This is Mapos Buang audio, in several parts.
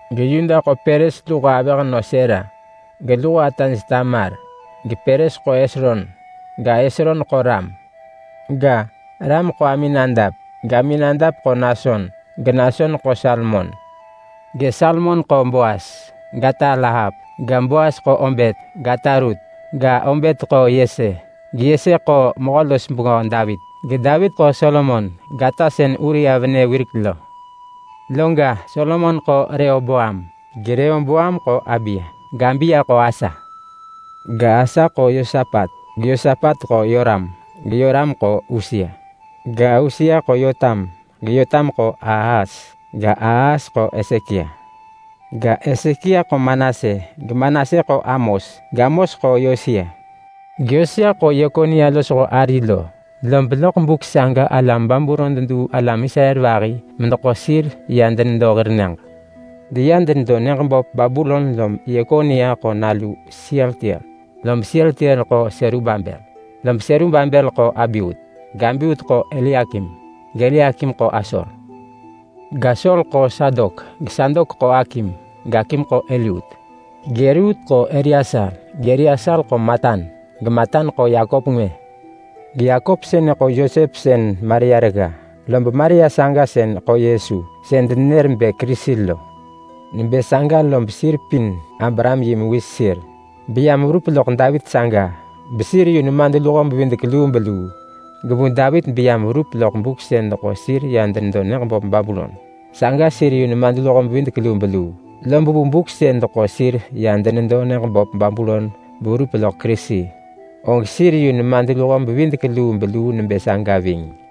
GeYuda ḳo Peres luho avëhnö Sera, geluho ataj Tamar. GePeres ḳo Hesron. Ga, Hesron ḳo Ram. Ga, Ram ḳo Aminadap, gAminadap ḳo Nason, geNason ḳo Salmon. GeSalmon ḳo Boas, gata Rahap. GeBoas ḳo Obet, gata Rut. Ga, Obet ḳo Yese, geYese ḳo Mehö-los-bengö Davit, geDavit ḳo Solomon, gata sën Uria venë wirek lo. Loga, Solomon ḳo Rehoboam, geRehoboam ḳo Abiya, gAbiya ḳo Asa. Ga, Asa ḳo Yosapat, geYosapat ḳo Yoram, geYoram ḳo Usia. Ga, Usia ḳo Yotam, geYotam ḳo Ahas ga, Ahas ḳo Hesekia. Ga, Hesekia ḳo Manase, geManase ḳo Amos, gAmos ḳo Yosia. GeYosia ḳo Yekonia losho ari lo, lob loḳ buk saga alam Babulon deduu alam Israel vahi medeḳo sir ya denedo hir nyëġ. Deya denedo nyëġ böp Babulon lom Yekonia ḳo nalu Sealtiel. Lob Sealtiel ḳo Serubabel, lob Serubabel ḳo Abiut, gAbiut ḳo Eliakim, gEliakim ḳo Asor. GAsor ḳo Sadok, geSadok ḳo Akim, gAkim ḳo Eliut. GEliut ḳo Eleasar, gEleasar ḳo Matan, geMatan ḳo Yakop ngwë. GeYakop sënë ḳo Yosep sën Maria regga, lob Maria saga sën ḳo Yesu, sën denenër bë Kerisi lo. Nebë saga lob sir pin Abraham yi mewis sir, beyam verup loḳ Davit saga, besir yu nemadluho-bevidek-lubeluu. Gevu Davit beyam verup loḳ buk sën deḳo sir ya denedo nyëġ böp Babulon, saga sir yu nemadluho-bevidek-lubeluu. Lob vu buk sën deḳo sir ya denedo nyëġ böp Babulon beverup loḳ Kerisi, og sir yu nemadluho-bevidek-lubeluu nebë saga ving.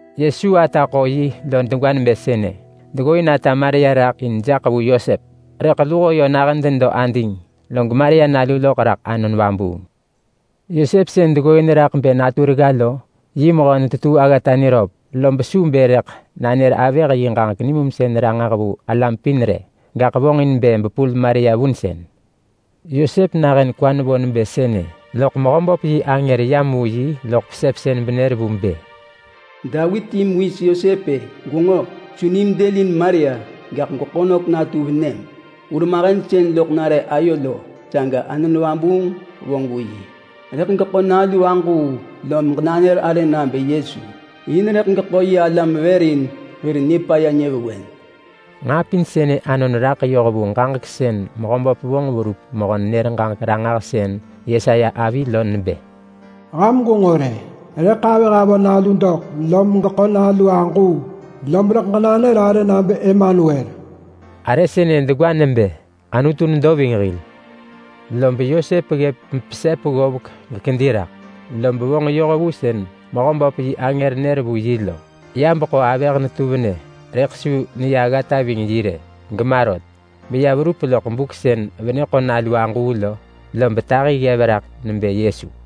Yesu ata ḳo yi lo degwa nebë sënë: Deggooin ata Maria raḳ in jaḳ vu Yosep, rëḳ luho yö nahën denedo, log Maria nalu loḳ raḳ Anon Vabuung. Yosep sën deggooin raḳ bë natu regga lo, yi mehö netetuu aggata niröp, lob su bë rëḳ nanër avëh yi ġaġek nimumsën ranġah vu alam pin rë. Gaḳ vonġin bë bepul Maria vunsën. Yosep nahën kwa nevo nebë sënë, loḳ Mehöböp yi angër yam vu yi loḳ pesepsën benër vu bë, “Davit yi mewis Yosep-e! Gwenġo! Su nim dëlin Maria! Gaḳ gweḳo nök natu venëm. Hurmahen sën loḳ nare ayo lo, saga Anon Vabuung vonġ vu yi. Rëḳ geḳo nalu aġuu lom ġenanër arë nabë Yesu. In rëḳ geḳo yi alam vër in hir nipaya nyëvewen.” Nġaa pin sënë anon raḳ yoh vu ġaġek sën Mehöböp vonġ verup mehö-nenër-ġaġek-ranġahsën Yesaya avi lo nebë: “Ham gwenġo rë! Rëḳ avëh avö nalu doḳ, lom geḳo nalu aġuu. Lob rëḳ ġenanër arë nabë Emanuel.” Arë sënë degwa nebë ‘Anutu nedo ving hil’. Lob Yosep ggëp mepesep ggovek gekedi raḳ, lom vonġ yoh vu sën Mehöböp yi angër nër vu yi lo. Ya beḳo avëh netu venë, rëḳ su neya aggata ving yi rë, gema rot, beya verup loḳ buk sën venë ḳo nalu aġuu lo. Lob tahi ggev raḳ nebë Yesu.